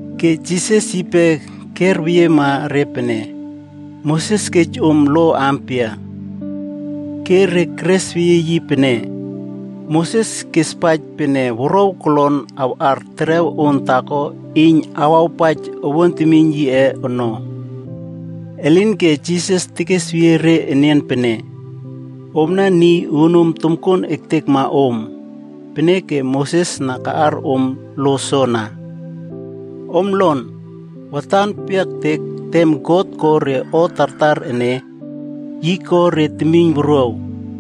Ke Jisas yipe kerweyiema re pene, “Moses kej om lo ampia?” Ke re teresweyie yi pene, “Moses kespaij pene wuruaw kolon awꞌar terew on taako iyn awawpaij owuan temiyn yiꞌe ono.” Elinke Jisas tekesweyie re enian pene, “Omna niy uunom tomkuon ektekma om, peneke Moses na kaꞌar om lo soana. Om lon, watan peyiaktek na tem God ko re o tartar ene, yi ko re temiynwuruaw.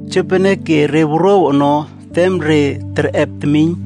‘Jopeneke re wuruaw ono tem re terꞌep temiyn,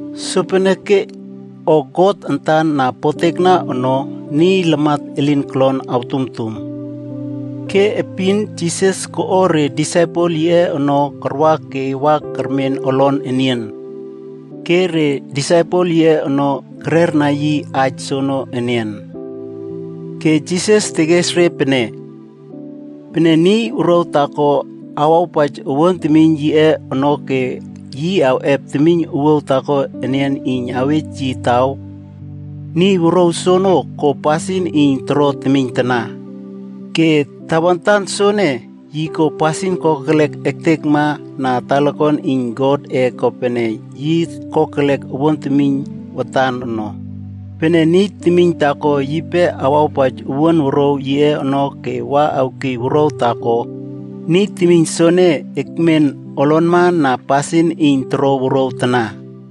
Sopeneke o God antan na potekna ono, niy lamat elin kolon artumtum.” Ke epin Jisas koꞌo re disaipel yiꞌe ono karwa ke wa kermen olon enian, ke re disaipel yiꞌe ono kererna yi aij soono enian. Ke Jisas tekes re pene, “Pene niy wuruaw taako awawpaij owuan temiyn yiꞌe ono ke yi awꞌep temiyn owuaw taako enian iyn awej yi taw, niy wuruaw soene ko pasin iyn toro temiyn tana. Ke tawantan soene, yi ko pasin kokelek ektekma na talakuan iyn Godꞌe kopene yi kokelek owuan temiyn watan ono. Pene niy temiyn taako yipe awawpaij owuan wuruaw yiꞌe ono ke wa awkiy wuruaw taako, niy temiyn soene ekmen olonma na pasin iyn toro wuruaw tana.”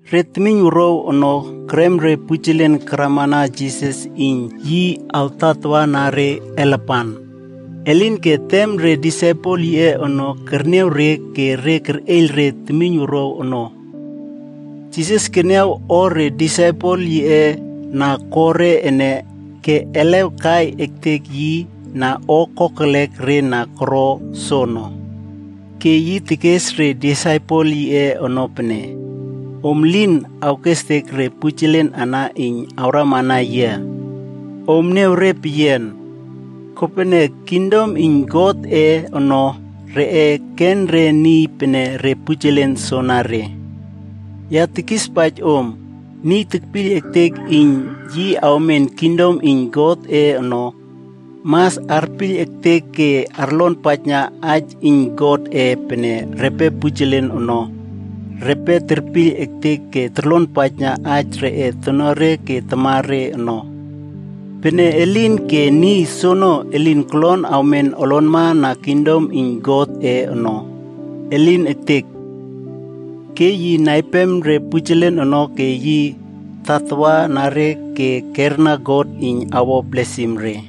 Re temiyn wuruaw ono kerem re pujelen karamana Jisas iyn yi awtatawana re alapan. Elinke tem re disaipel yiꞌe ono kerniaw re ke re kerꞌeiyl re temiyn wuruaw ono. Jisas keniaw o re disaipel yiꞌe na koro ene ke elew kai ektek yi na o kokelek re na koro soono. Ke yi tekes re disaipel yiꞌe ono pene, “Om lin awkestek re pujelen ana iyn awramana yia. Om akniaw re peyian. Kopene, kingdom iyn Godꞌe ono, reꞌe ken re niy pene re pujelen soanare. Ya tekispaij om, niy tekpiyl ektek iyn yi awmen kingdom iyn Godꞌe ono, mas arpiyl ektek ke arlonpaijna aij iyn Godꞌe pene repe pujelen ono, repe terpiyl ektek ke torlonpaij aij reꞌe tonuare ke tamare ono. Pene elin ke niy soono elin kolon awmen olonma na kingdom iyn Godꞌe ono. Elin ektek!” Ke yi naima re pujelen ono ke yi tatawa na re ke kerna God iyn awo blesim re.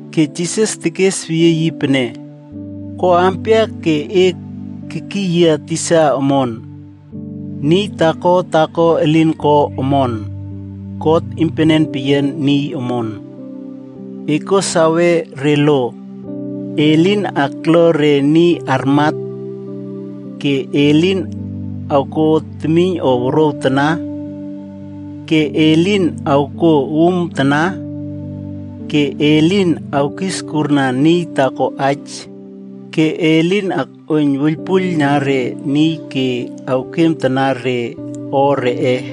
Ke Jisas tekes weyie yi pene, “Ko ampia ke e tekiy yia tisa omon? Niy taako taako elin ko omon. God iynpenen peyian niy omon. E kuo sawe re lo: ‘E lin akla re niy armat, ke e lin awkuo temiyn o wuruaw tana, ke e lin awkuo uumtana, ke e lin awkiskurna niy taako aij, ke e lin akꞌuoiyn wuiylpuiylna re niy ke awkiem tana re o reꞌe,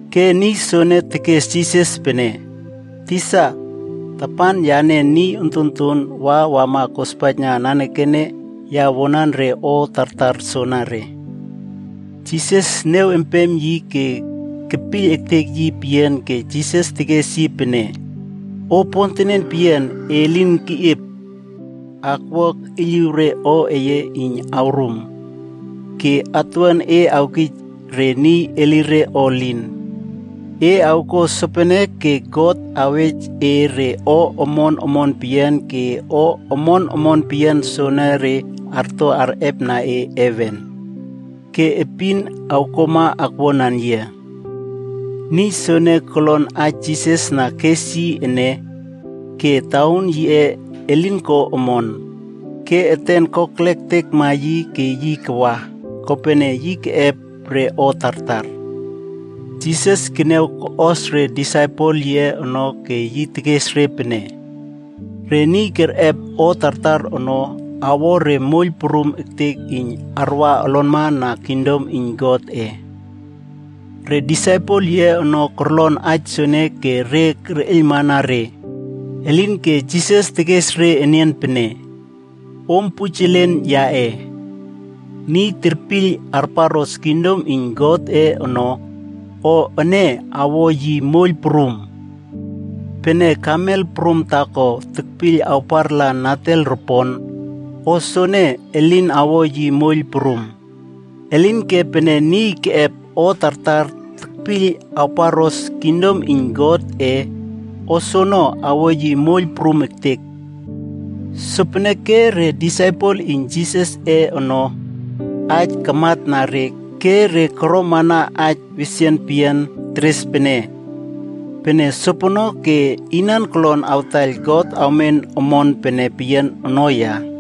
Ke niy soene tekes Jisas pene, “Tisa, tapan yane niy ontonton wa wama kospaijna nanekene ya wuanan re lo tartar soanare.” Jisas niaw empem yi ke kepiyl ektek yi peyian ke Jisas tekes yi pene, “O pontenen peyian e lin keꞌiep. Ekwua ekꞌiyliw re o eye niy awrum, ke atuwuan e awkij re niy elire o elin. E awkuo sopene ke God awej e re o omon omon peyian ke o omon omon peyian soonore arto arꞌepna e heven. Ke epin awkuama akwuanan yia.” Niy soene kolon aij Jisas na kes yi ene, ke tauun yiꞌe elin ko omon, ke eten kokelektekma yi ke yi kawa. Kopene, yi keꞌep re o tartar. Jisas keniawkos re disaipel yiꞌe ono ke yi tekes re pene, “Re niy kerꞌep o tartar ono awo re moiyl prum ektek iyn arwa olonma na kingdom iyn Godꞌe.” Re disaipel yiꞌe ono korlon aij soene ke re kerꞌeiylmana re. Elinke Jisas tekes re enian pene, “Om pujelen yaꞌe, niy terpiyl arparꞌos kingdom iyn Godꞌe ono, o ene awo yi moiyl prum. Pene kamel prum taako tekpiyl awpartala natel ropon, o soene elin awo yi moiyl prum. Elinke pene niy keꞌep o tartar tekpiyl awparꞌos kingdom iyn Godꞌe, o soono awo yi moiyl prum ektek.” Sopeneke re disaipel iyn Jisasꞌe ono, aij kamatna re ke re koromana aij wesian peyian teres pene, “Pene sopono ke inan kolon awtaiyl God awmen omon pene peyian ono ya?”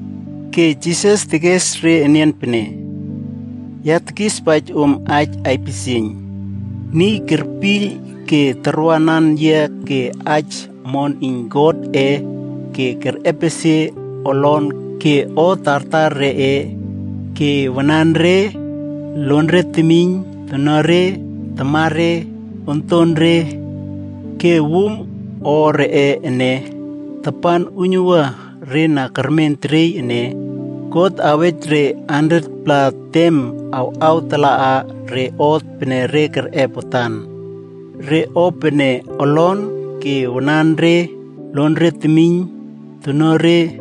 Ke Jisas tekes re enian pene, “Ya tekispaij om aij aipisieiyn, niy kerpiyl ke karwanan yia ke aij omon iyn Godꞌe ke kerꞌepesie olon ke o tartar reꞌe ke wananre, lonre temiyn, tonuare, tamare, ontore, ke wum o reꞌe ene, tapan uiynuwua re na kermen teriey ene, God awej re 100-pla tem awꞌawtala re o pene re kerꞌep watan: Re o pene olon ke wananre, lonre temiyn, tonuare,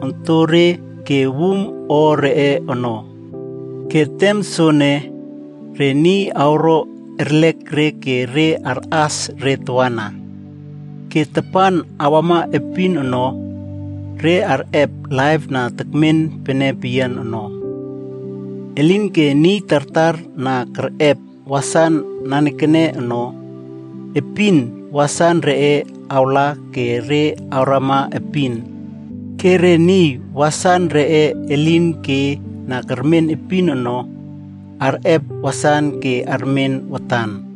ontore, ke wum o reꞌe ono. Ke tem soene, re niy awro erlek re ke re arꞌas re tawana. Ke tapan awama epin ono, re arꞌep laip na tekmen pene peyian ono. Elinke niy tartar na kerꞌep wasan nanekene ono, epin wasan reꞌe awla ke re awrama epin. Ke re niy wasan reꞌe elin ke na kermen epin ono, arꞌep wasan ke armen watan.”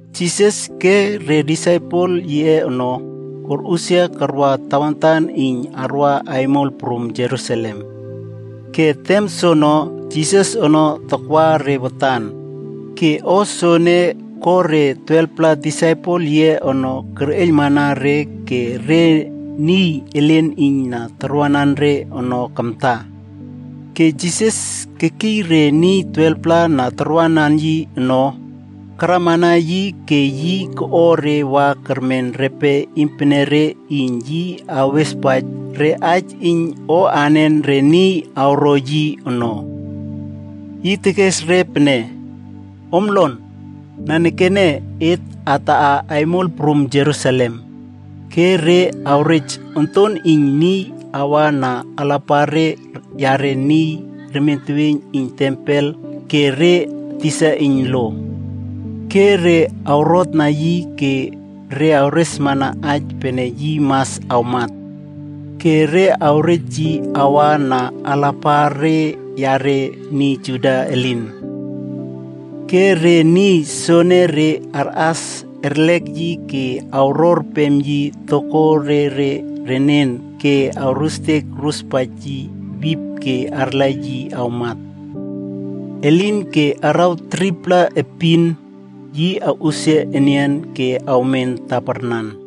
Jisas ke re disaipel yiꞌe ono korꞌusia karwa tawantan iyn arwa aimol prum Jerusalem. Ke tem soono, Jisas ono takwa re watan. Ke o soene ko re 12-pla disaipel yiꞌe ono kerꞌeiylmana re ke re niy elen iyn na tarwanan re ono kamta. Ke Jisas kekiy re niy 12-pla na tarwanan yi ono, karamana yi ke yi koꞌo re wa kermen repe iynpenere iyn yi awespaij re aij iyn o anen re niy awro yi ono. Yi tekes re pene, “Om lon. Nanekene et ataꞌa aimol prum Jerusalem, ke re awrej Onton iyn Niy awa na alapare yare niy remien teweiyn iyn tempel ke re tisa iyn lo. Ke re awrotna yi ke re awresmana aij pene yi mas awmat. Ke re awrej yi awa na alapare yare niy Juda elin. Ke re niy soenere arꞌas erlek yi ke awrorpem yi tokore renen ke awrustek awruspaij yi wip ke arla yi awmat. Elinke araw 3-pla epin, yi awꞌusia enian ke awmen taparnan.”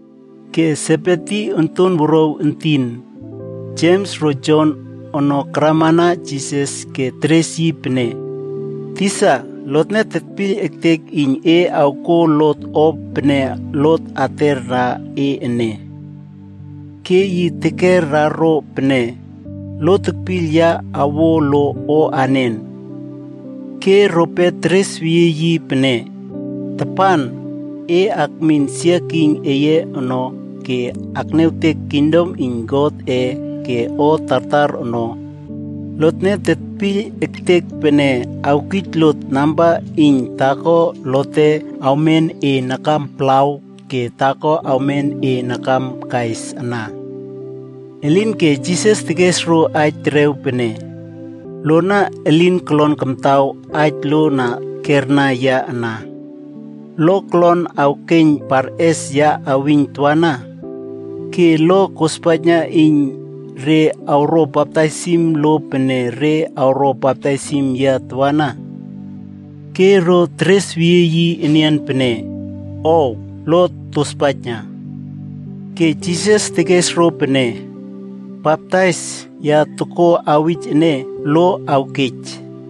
Ke Sebedi onton wuruaw entin, Jems ro Jon ono karamana Jisas ke teres yi pene, “Tisa, lotne tetpiyl ektek iyn e awkuo lot o pene lot atera e ene.” Ke yi tekera ro pene, “Lo tekpiyl ya awo lo o anen?” Ke rope teresweyie yi pene, “Tapan e akmin olonmana glori eye ono ke akniawtek kingdom iyn Godꞌe ke o tartar ono, lotne tetpiyl ektek pene awkij lot namba iyn taako lote awmen e nakam palawd ke taako awmen e nakam kais ana.” Elinke Jisas tekes ro aij terew pene, “Lona elin kolon kamtaw aij lo na kerna yia ana. Lo kolon awkeiyn parꞌes ya awiyn tawana? Ke lo kospaijna iyn re awro baptaisim lo pene re awro baptaisim yia tawana?” Ke ro teresweyie yi enian pene, “Ow, lot tospaijna.” Ke Jisas tekes ro pene, “Baptais ya tokuo awij ene, lo awkej.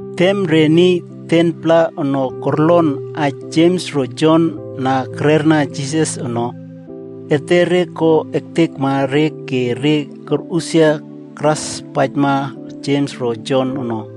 Tem re niy 10-pla ono korlon aij Jems ro Jon na kererna Jisas ono, etere ko ektekma re ke re korꞌusia karꞌaspaijma Jems ro Jon ono.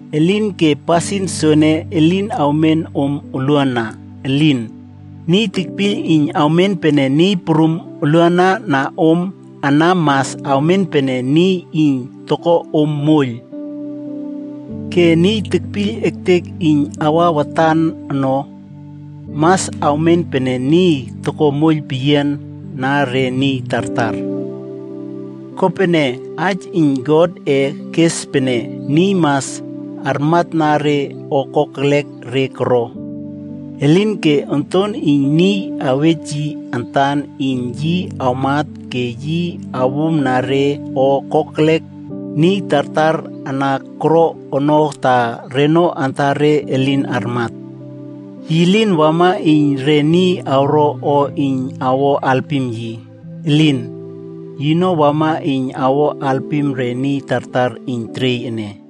Elinke pasin soene elin awmen om oluana. Elin! Niy tekpiyl iyn awmen pene niy prum oluana na om ana mas awmen pene niy iyn toko om moiyl. Ke niy tekpiyl ektek iyn awa watan ono, mas awmen pene niy toko moiyl peyian na re niy tartar. Kopene, Aij iyn Godꞌe kes pene, niy mas armatna re o kokelek re koro. Elinke Onton iyn Niy awej yi antan iyn yi awmat ke yi awumna re o kokelek niy tartar na koro ono ta reno antare elin armat. Yi lin wama iyn re niy awro o iyn awo alpim yi. Elin! Yino wama iyn awo alpim re niy tartar iyn teriey ene.”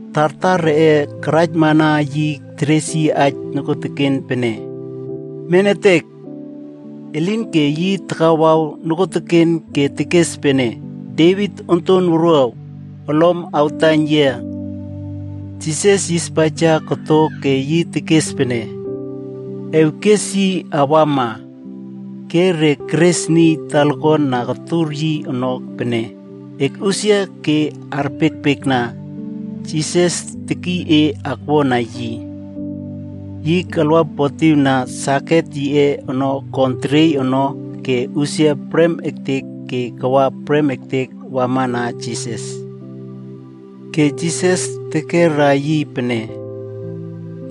Tartar reꞌe karaijmana yi teres yi aij nokuoteken pene, “Menetek!” Elinke yi takawawna nokuoteken ke tekes pene, “Devit Onton Wuruaw, olom awtaiyn yia!” Jisas yispaija koto ke yi tekes pene, “Ewkes yi awama.” Ke re keres niy talakuan na kotur yi ono pene, “Ekꞌusia ke arpiekpiekna, Jisas tekiy e akwuana yi.” Yi kalwapotiwna saket yiꞌe ono kon teriey ono ke usia prem ektek ke kawa prem ektek wamana Jisas. Ke Jisas tekera yi pene,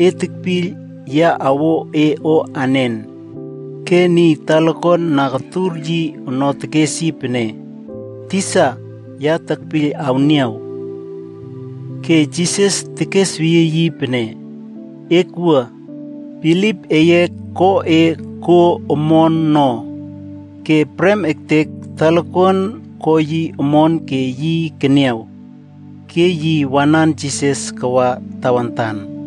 “E tekpiyl ya awo e o anen?” Ke niy talakuan na kotur yi ono tekes yi pene, “Tisa, ya tepiyl awniaw.” Ke Jisas tekesweyie yi pene, “Ekwua. Bilip eye ko e kuo omon no.” Ke prem ektek talakuan ko yi omon ke yi keniaw. Ke yi wanan Jisas kawa tawantan.